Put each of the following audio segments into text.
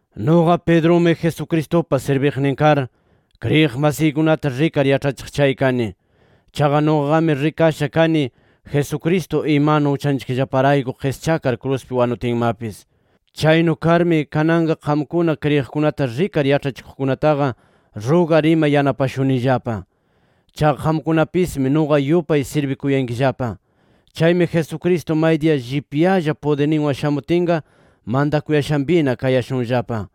Nuqa Pedrumi Jesucristupa sirbiqnin kar, kriyiq masiykunata rikar yaĉhachiq chay kani. Chaqa nuqaqami rikasha kani, Jesucristo imanu uchanchikllaparayku qischakar kruspi wanutinmapis. Chaynu karmi, kananqa qamkuna kriyiqkunata rikar yaĉhachikuqkunataqa rugar ima yanapashunanillapa. Chaqa qamkunapismi nuqa yupay sirbikuyankillapa. Chaymi Jesucristo maydiya llipyalla pudirninwan shamutinqa, mantakuyashanpina kayashunllapa.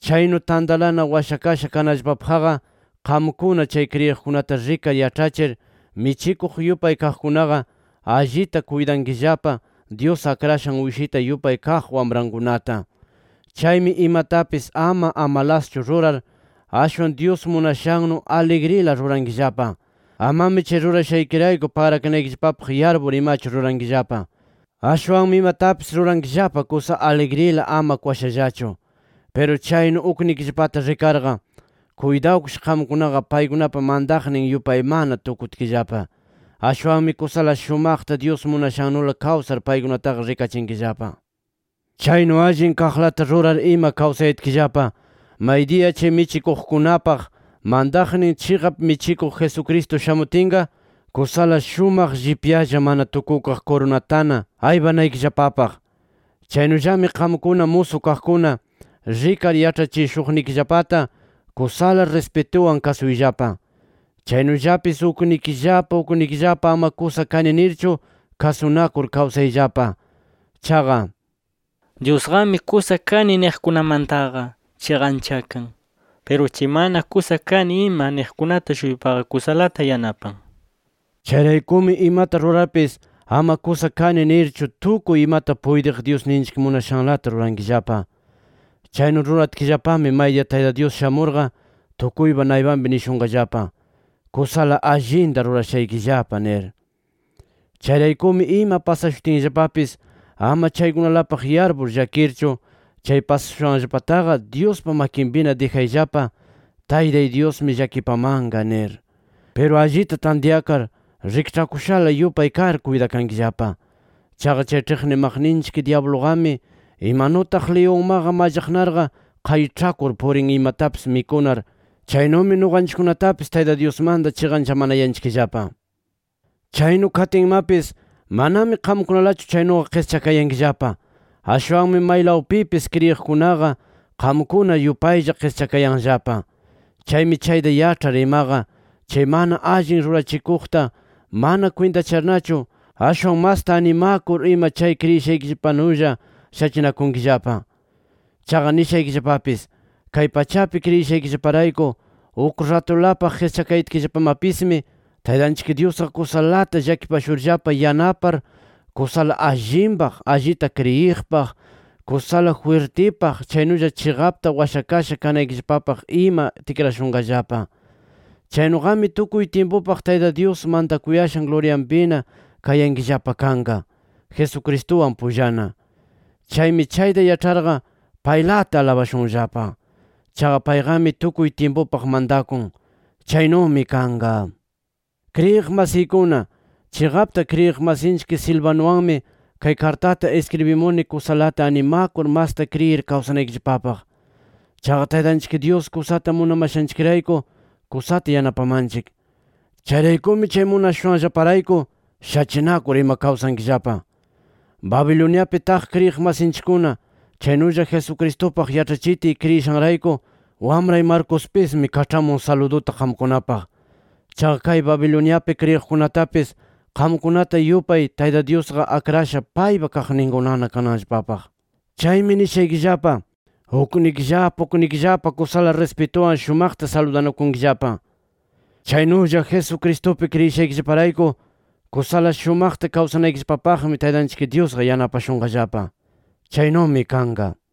Chaynu tantalana washakasha kananllapapaqqa, qamkuna chay kriyiqkunata rikar yaĉhachir michikuq yupay kaqkunaqa, allita kuytankillapa Dyus akrashan uyshita yupay kaq wamrankunata. Chaymi imatapis ama amalaschu rurar, ashwan Dyus munashannu aligrila rurankillapa. Amami chay rurashaykirayku pagrakanaykillapapaq yarpur imachu rurankillapa. Ashwanmi imatapis rurankillapa kusa aligrila, ama kwashallachu. Piru chaynu uknikillapata rikarqa, kuytawkish qamkunaqa paykunapa mantaqnin yupaymana tukutkillapa. Ashwanmi kusala shumaqta Dyus munashannula kawsar paykunataqa rikachinkillapa. Chaynu allin kaqlata rurar ima kawsayatkillapa, maydiya chay michikuqkunapaq mantaqnin chiqap michikuq Jesucristo shamutinqa, kusala shumaq llipyalla mana tukukaq kurunatana aypanaykillapapaq. Chaynullami qamkuna musu kaqkuna, rikar yaĉhachishuqnikillapata kusala rispituwan kasuyllapa. Chaynullapis uknikillapa uknikillapa ama kusa kani nirchu, kasunakur kawsayllapa. Chaqa “Dyusqami kusa kani niqkunamantaqa chiqanchakan. Piru chay mana kusa kani ima niqkunata-shuypaqa kusalata yanapan”. Chayraykumi imata rurarpis, ama kusa kani nirchu tukuy imata puytiq Dyusninchik munashanlata rurankillapa. Chaynu ruratkillapami maydiya Tayta Dyus shamurqa tukuypa naypanpi nishunqallapa: “Kusala allinta rurashaykillapa” nir. Chayraykumi ima pasashutinllapapis ama chaykunalapaq yarpur llakirchu, chay pasashushanllapataqa Dyuspa makinpina dijayllapa, ¡Taytay Dyusmi llakipamanqa! nir. Piru allita tantyakar, rikĉhakushala yupay kar kuytakankillapa. Chaqa chay ĉhiqnimaqninchik dyabluqami, imanutaq liyunmaqa mallaqnarqa qayĉhakur purin imatapis mikunar, chaynumi nuqanchikkunatapis Tayta Dyusmanta chiqanchamanayanchikllapa. Chaynu katinmapis manami qamkunalachu chaynuqa qischakayankillapa, ashwanmi maylawpipis kriyiqkunaqa qamkuna yupaylla qischakayanllapa. Chaymi chayta yaĉhar imaqa, chay mana allin rurachikuqta mana kwintacharnachu, ashwan masta animakur ima chay kriyishaykillapanulla shachinakunkillapa. Chaqa nishaykillapapis: Kay pachapi kriyishaykillaparayku uk ratulapaq qischakayatkillapamapismi, Taytanchik Dyusqa kusalata llakipashurllapa yanapar kusala allinpaq, allita kriyiqpaq, kusala jwirtipaq, chaynulla chiqapta washakasha kanaykillapapaq ima tikrashunqallapa. Chaynuqami tukuy tyimpupaq Tayta Dyus mantakuyashan luryanpina kayankillapa kanqa Jesucristuwan pullana. ¡Chaymi chayta yaĉharqa paylata alabashunllapa! ¡Chaqa payqami tukuy tyimpupaq mantakun! ¡Chaynumi kanqa! Kriyiq masiykuna, chiqapta kriyiq masinchik Silvanuwanmi kay kartata iskribimuni kusalata animakur masta kriyir kawsanaykillapapaq. Chaqa Taytanchik Dyus kusata munamashanchikrayku kusata yanapamanchik. Chayraykumi chay munashushanllaparayku, shachinakur ima kawsankillapa. Babiloniapi taq kriyiq masinchikkuna, chaynulla Jesucristupaq yaĉhachitiy kriyishanrayku wamray Marcospismi kaĉhamun saluduta qamkunapaq. Chaqa kay Babiloniapi kriyiqkunatapis qamkunata yupay, Tayta Dyusqa akrasha paypa kaqninkunana kananllapapaq. Chaymi nishaykillapa: Uknikillapa uknikillapa kusala rispituwan shumaqta saludanakunkillapa. Chaynulla Jesucristupi kriyishaykillaparayku, kusala shumaqta kawsanaykillapapaqmi Taytanchik Dyusqa yanapashunqallapa. Chaynumi kanqa.